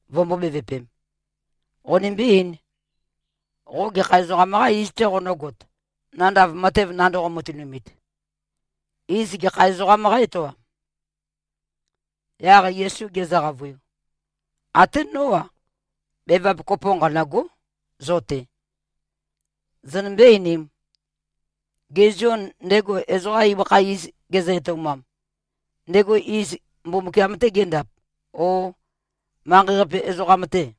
vømbō-bevøpem, “Qonimbí-eīn. Qo gekha ezoqam-qā iz-tē qonǿgot, nandav matev nandoqo-matønumit? Iz gekha ezoqām qá-etoam?” Yaq Yesu gezø-qavøiu, “Até nó-a, bevap kopo nqanø̂gó, zo-te. Zonømbé-einīm. Gê, Zion, ndego ezoqa ibøkha iz gezø-etoumam, ndego iz Mbumbukiam-tê gendap, ó, manqei-qape ezoqam-tè?”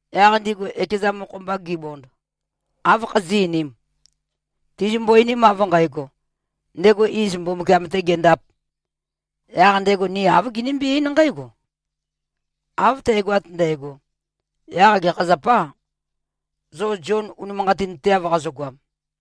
Yaq ndigu ekeza mokho-mba gibond, “Áv khazí꞉-einīm? Tizimbo-einim av nqægo, ‘Ndego iz Mbumbukiam-tē gendāp,’ yaq ndego ni āv ginimbí-eín nqǽgo, ‘Av tægoat ndægo, yaq gekha zapâ, zo Zion unimanqatinteav qazogoam?’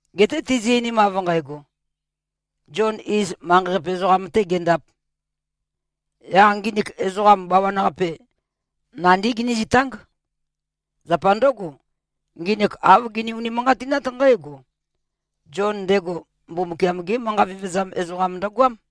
Geté tizi-einim av nqægo, ‘Zion, iz, manqei-qape ezoqam-tē gendāp,’ yaq nginik ezoqa bawan-qape, nandí ginízitáng. Zapa ndǿgo, nginik āv gini-unimanqatinát nqǽgo: Zion ndego Mbumbukiam-gé manqa vevezam ezoqam ndøgoám.”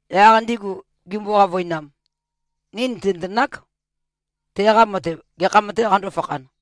Yaq ndigu gimbo-qavøinam, “Ni nìtinøtenák, teqa matev gekham-tē qandō-fakhan.”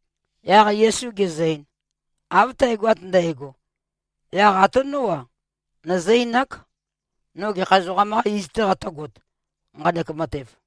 Yaq Yesu gezø-ein, “Av tægoat ndægo, yaq até nó-a, nøzǿ-einák, no gekha ezoqam-qā iz-tē qatø̄got, nqanek matev.”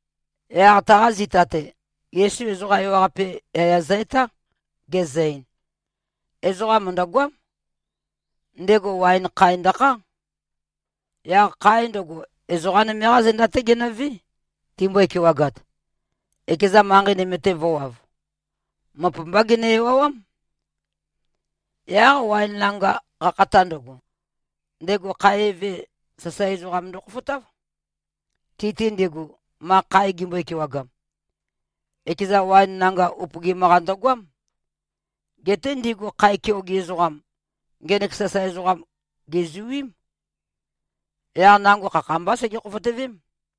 Yaq taqa zita-te, Yesu ezoqa ewaqape yaya zø-etá, gezø-ein, “Ezoqa mø̀ndøgoám. Ndego waen khae ndøkhá. Yaq khae ndøgo, ezoqa nøme-qá zenda-té genøvé, timbøe-kewagat, ekezan manqei nøme-te vø̄wav. Møp-mbá gene-ewawám. Yaq waen nanga qakhata ndøgo, ndego khae eve, sasae ezoqam ndøkhofotáv, ti-te ndigu, ma khae gimbøe-kewagam. Ekeza waen nanga upøgim-qa ndøgoám. Geté ndigu khae keoge ezoqam, ngenek sasae ezoqam gèzuím. Yaq nango khakha-mbá sege-khofotøvém.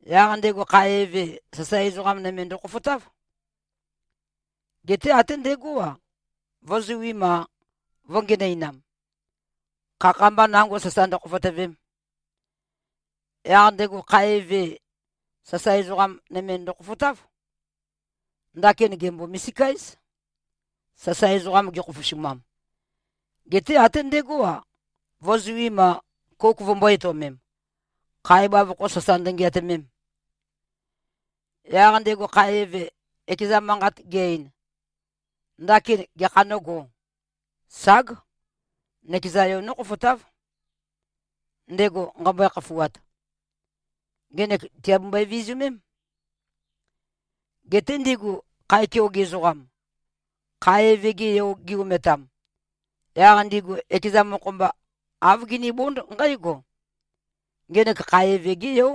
Yaq ndego khae eve, sasae ezoqa nøme ndøkhofotáv. Geté até ndegó-a, vø̄zuim-a, vø̄ngenøinam, khakha-mba nango sasa ndøkhofotøvem. Yaq ndego khae eve, sasae ezoqa nøme ndøkhofotáv. Ndakin gèmbo-misika-éz, sasae ezoqam gekhofosumam. Geté até ndegó-a, vø̄zuim-a, kouk vømbō-etøomem, khae bavokho sasa ndøngeatømem. Yaq ndego khae eve, ekeza manqa ge-ein, ‘Ndakin gekhā nógō? Ság! Nøkeza yo nókhofotáv, ndego nqæmbøe-khafuat. Ngenek tìabembøe-vizumém.’ Geté ndigu khae keoge ezoqam, khae eve-ge yo gi-ometam, yaq ndigu ekeza mokho-mba āv ginibónd nqǽgo, ‘Ngenek khae eve-gé yó.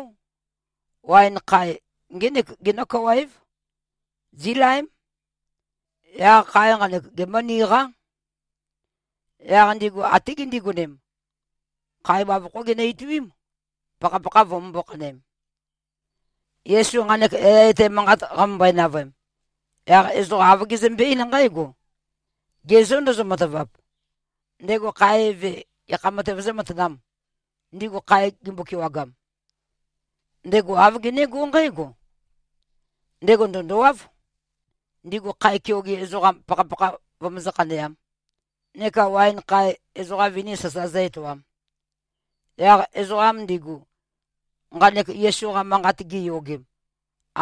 Waen khae ngének genó-kawa-év. Zílaém. Yaq khae nqanek, gemǿniqá.’ Yaq ndigu até gindigonem, khae bavokhó ginø-ituím, pakhapakha vømømbó-khanøem.” Yesu nqanek yaya etæ manqat qamømbøe-navøem, yaq ezoqa āv gezømbe-eín nqǽgo, “Ge zô, ndozo-matavap? Ndego khae eve, gekha matev zǿmatanām, ndigu khae gimbo-kewagam? Ndego āv genégó nqǽgo: Ndego ndø̀ndowáv, ndigu khae keoge ezoqam pakhapakha vømøzǿ-khaneām, neka waen khae, ezoqa vini sasa zǿ-etoām.” Yaq ezoqam ndigu, nqanek Yesu-qa manqat giyogem,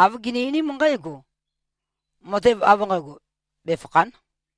āv gini-einím nqǽgo, “Matev av nqægo befàkha᷄n!”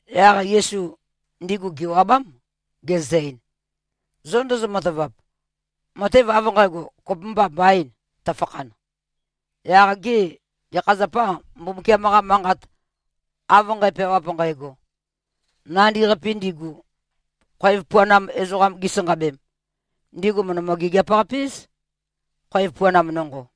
Yaq Yesu ndigu gèwabám, gezø-ein, “Zo ndozo-matavap, matev av nqægo kopømba mbaīn, tøfakhan, yaq gê, gekha zapâ, Mbumbukiam-qa Manqat av nqæpeawap nqægo: ‘Nandi-qapi ndigu, khoev puanam ezoqam gisanqabem, ndigu mø̀ndømø-gigiap-qape-éz, khoev puanam nonqo.’?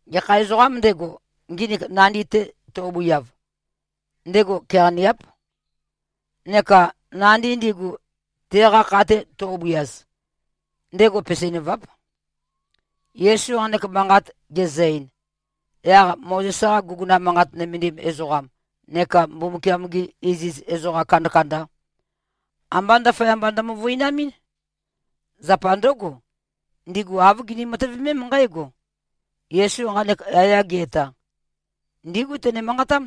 Gekha ezoqām ndego, nginik nandi-te to꞉bøiav, ndego keqaniáp. Neka nandi ndigu, teqa kha-te to꞉bøiaz, ndego peseinøváp.” Yesu nqanek manqat gezø-ein, yaq Mozes-qa guguna manqat nømendim ezoqam neka Mbumbukiam-gi iziz ezoqa kandakanda, ambá ndaføyamba ndømøvøinamɨ́n. Zapa ndǿgo, ndigu āv gini-matøvemém nqǽgo: Yesu nqanek yaya ge-eta, ndígu tene-manqatám.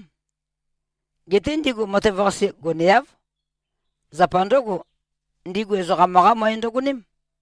Geté ndigu matev-qase goneáv. Zapa ndǿgo, ndigu ezoqam-qá møe ndøgoném.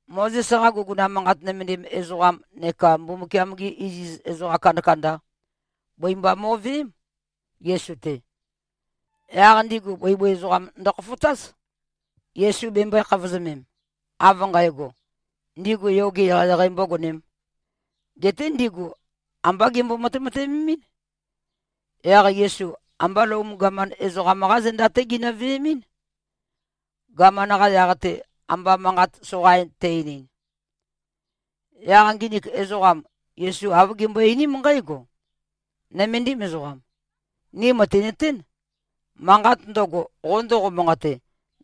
Mozes-qa guguna manqat nømendim ezoqam neka Mbumbukiam-gi iziz ezoqa kandakanda, bøi mba mo꞉veém, Yesu-te. Yaq ndigu bøibøi ezoqam ndøkhofotáz, Yesu bemømbøē-khavozømem, av nqægo, ndigu yoge eqeieqei mbōgonēm. Geté ndigu ambá gembo-matemateømemín. Yaq Yesu ambá Lom gaman ezoqam-qá zenda-té ginø-veemɨ́n, gaman-qa yaq-te amba manqat soqain te-einin. Yaq nginik ezoqam, Yesu āv gimbøe-einím nqǽgo, “Nøméndim ezoqam, ni mø̀tinøtén, manqat ndøgo, qo ndoqo-manqate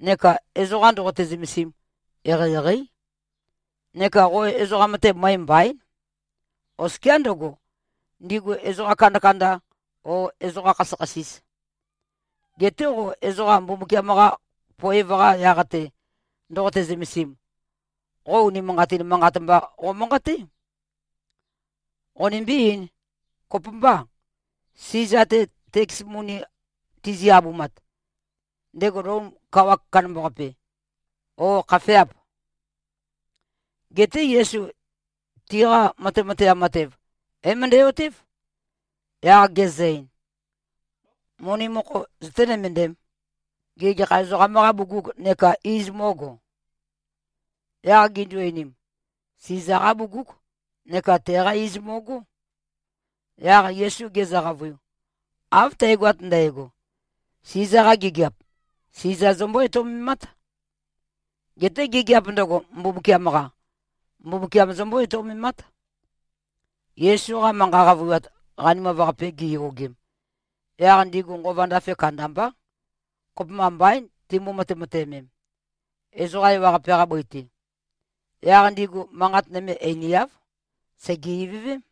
neka ezoqa ndoqote-zømesim, eqeieqeí. Neka qo ezoqam-te møe mbaín, oskiá ndøgo, ndigu ezoqa kandakanda o ezoqa khasøkhasis. Geté qo ezoqa Mbumbukiam-qa poev-qa yaq-te ndoqote-zømesim, qo unimanqatin manqat mba qomanqaté. Qonimbí-eīn. Kopømbâ, Siza-te teks moni tizi-abumat, ndego Lom kawa kandambaqape, ó, khafeâp?” Geté Yesu tiqa matemateam matev, é-møndæ-otév, yaq gezø-ein, “Moni mokho zøté-nømøndēm. Gê, gekha ezoqam-qâ bugug neka iz mó꞉go?” Yaq gindu-einim, “Siza-qá bugúg, neka teqá iz mo꞉gó.” Yaq Yesu gezø-qavøiu, “Av tægoat ndægo, Siza-qa gigiap, Siza zombó-etoumemát. Geté gigiap ndøgo, Mbumbukiam-qa, Mbumbukiam zombó-etoumemát.” Yesu-qa manqa qavøiwat qanimav-qape giyogem, yaq ndigu nqova ndafe kandambá. Kopømba mbaín, timbo-matemateømem, ezoqa ewaqape-qa bøi-te. Yaq ndigu manqat nøme einiáv. Sège-ivøvém.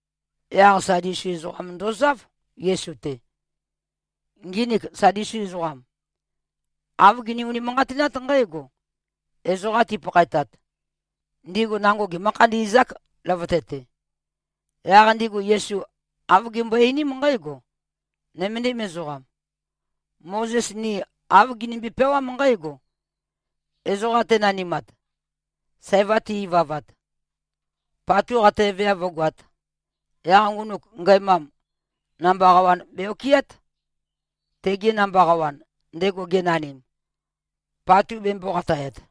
Yaq Sadusi ezoqam ndozáv, Yesu-te. Nginik Sadusi ezoqam, āv gini-unimanqatinát nqǽgo: Ezoqa tipakhaetat, ndigu nango gemǿ-khandi꞉zák, løvøte-te. Yaq ndigu Yesu āv gimbøe-einím nqǽgo, “Nøméndim ezoqam, Mozes ni āv ginimbi-peawám nqǽgo: Ezoqa tenanimat, sæva te-ivavat, patu qataeveav vǿgoāt, yaq ngunuk ngæmam, namba qawan be-okɨát, tege namba qawan, ndego genanim, patu bembō-qatayat.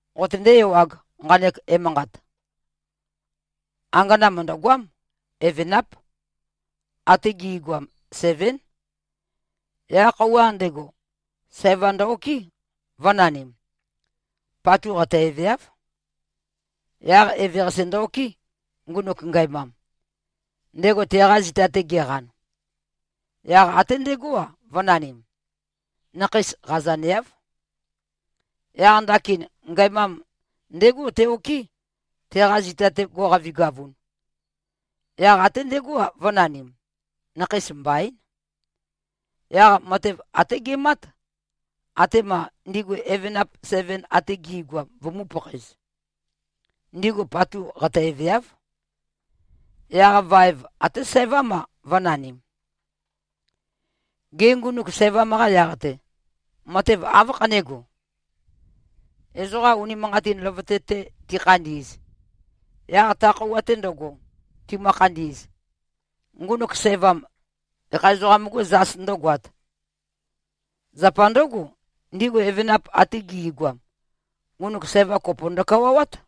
Qotøndé-ewāg, nqanek emanqat. Angana mø̀ndøgoám. Evenáp. Até gi꞉goam sevén. Yaq khøuwa ndego, sævam ndø-okɨ́, vø̄nanim. Patu qataeveáv. Yaq eveqase ndø-okɨ́, ngunuk ngæmam, ndego teqa zita-te geqan. Yaq até ndegó-a, vø̄nanim. Nakheis qazaneáv. Yaq ndakin ngæmam ndégo te-okɨ́, teqa zita-te go꞉qavigavun. Yaq até ndegó-a, vø̄nanim. Nakheis mbaín. Yaq matev até gemát, atema ndigu evenap seven ate gi꞉goam vømū-pakhaez. Ndigu patu qataeveáv. Yaq vaev até sævám-a, vø̄nanim. Gê, ngunuk sævam-qa yaq-te, matev áv khanégo? Ezoqa unimanqatin løvøte-te tikhandi꞉z, yaq ta khøuwa-te ndøgo, timø-khandi꞉z, ngunuk sævam, gekha ezoqam-gû zas ndǿgoāt? Zapa ndǿgo, ndigu evenap ate gi꞉goam, ngunuk sævam kopo ndøkawawát.”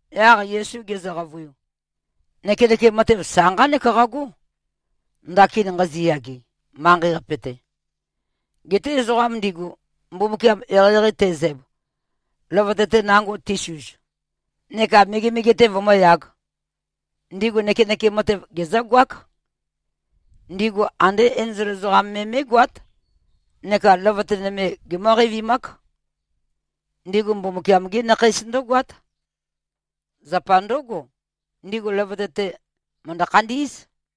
Yaq Yesu gezø-qavøiu, “Nøkenøkem matev sa nqánek qagó, ndakin nqaziyage, manqei-qape-te. Geté ezoqa ndigu, Mbumbukiam eqeieqei tezæb, løvøte-te nango tisuz, neka megemege-te vømǿyāg, ndigu nøkenøkem matev gezǿgoák. Ndigu andé enzol ezoqam me mé꞉goát, neka løvøte nøme gemǿ-qeivimák. Ndigu Mbumbukiam-gí nakheís ndǿgoát. Zapa ndǿgo, ndigu løvøte-te mø̀ndø-khandí꞉z.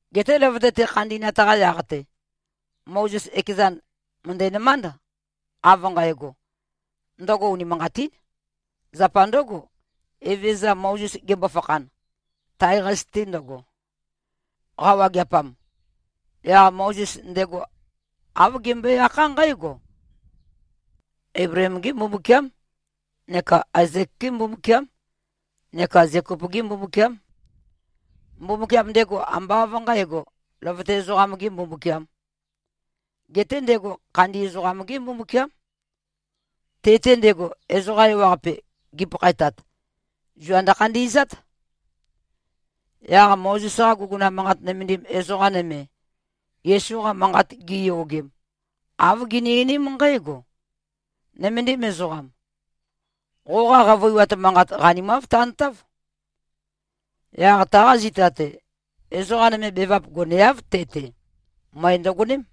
Geté løvøte-te khandi꞉nat-qa yaq-te, Mozes ekezan mø̀ndænømánd, av nqægo, ndøgo unimanqatín. Zapa ndǿgo, Evezøza Mozes gembo-fakhan, tae-qase-te ndøgo, qawageapam, yaq Mozes ndego āv gembøe-akhá nqǽgo: Eibleem-gé Mbumbukiám neka Aezek-gé Mbumbukiám neka Zekop-gé Mbumbukiám. Mbumbukiam ndego ambá av nqǣgo, løvøte ezoqam-gē Mbumbukiām, geté ndego khandi ezoqam-gé Mbumbukiám. Te-te ndego, ezoqa ewaqape, gipakhaetat, zua ndøkhandi꞉zát.” Yaq Mozes-qa guguna manqat nømendim ezoqa nøme, Yesu-qa manqat giyogem, āv gini-einím nqǽgo, “Nøméndim ezoqam. Qoqa qavøiwat manqat, qanimáv tantáv.” Yaq taqa zita-te, ezoqa nøme bevap goneáv, te-te. Møe ndøgoném.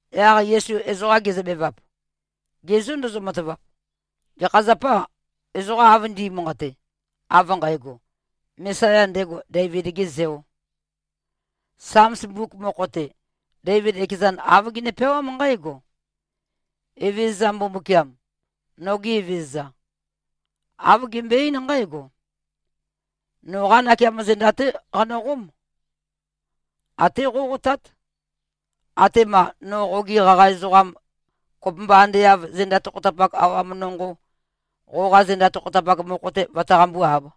Yaq Yesu ezoqa gezøbevap, “Ge zô, ndozo-matavap? Gekha zapâ, ezoqa av ndi꞉manqate, av nqægo, Mesaya ndego, Deivid-gē Zeō? Sams mbuk mokho-te, Deivid ekezan āv gene-peawám nqǽgo: Evezøza Mbumbukiam, noge Evezøza, āv gembøe-eín nqǽgo, ‘Noqá nakeamo zenda-té qanøqóm. Até qóqotát, atema no qogi qaqa ezoqam, kopømba ande av zenda tokhotapak awam nonqo, qoqa zenda tokhotapak mokho-te vøtaqambú-āb.’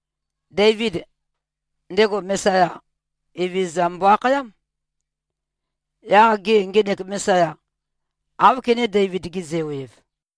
Deivid, ndego Mesaya, Evezøza mbo-akhayám. Yaq gê, ngenek Mesaya, áv kené-Deivid-ge-zeo-ev?”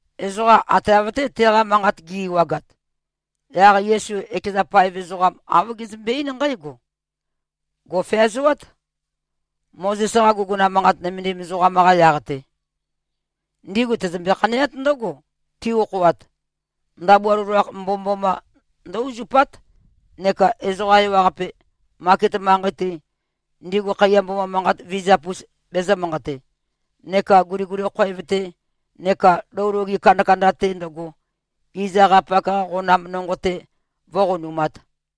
Ezoqa ate av-té teqa manqat gi꞉-ewagat, yaq Yesu ekeza paev ezoqam āv gezømbe-eín nqǽgo, “Gò꞉feazoát, Mozes-qa guguna manqat nømendim ezoqam-qa yaq-te. Ndigu tøzømbe-khaneát ndǿgo, ti-okhoat, ndabua loloakh mbomømboma ndǿ-uzupát, neka ezoqa ewaqape, maket manqei-te, ndigu khaiya mboma manqat vizap-us bezø̄-manqate, neka guliguli khoev-te neka lou loge kandakanda-te ndøgo, iz akhayapak-qa qonam nonqo-te vǿqonumāt.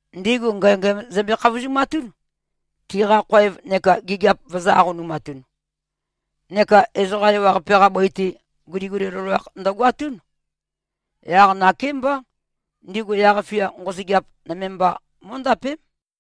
Ndigu ngængæm zømbe-khavozumatún, tiqa khoev neka gigiap vøzø̄-aqonumatun. Neka ezoqa ewaqape-qa bøi-te, guliguli loloakh ndøgoatún. Yaq nakémbá ndigu yaq-fia nqosøgeap, nøme mba mó꞉ndapém.”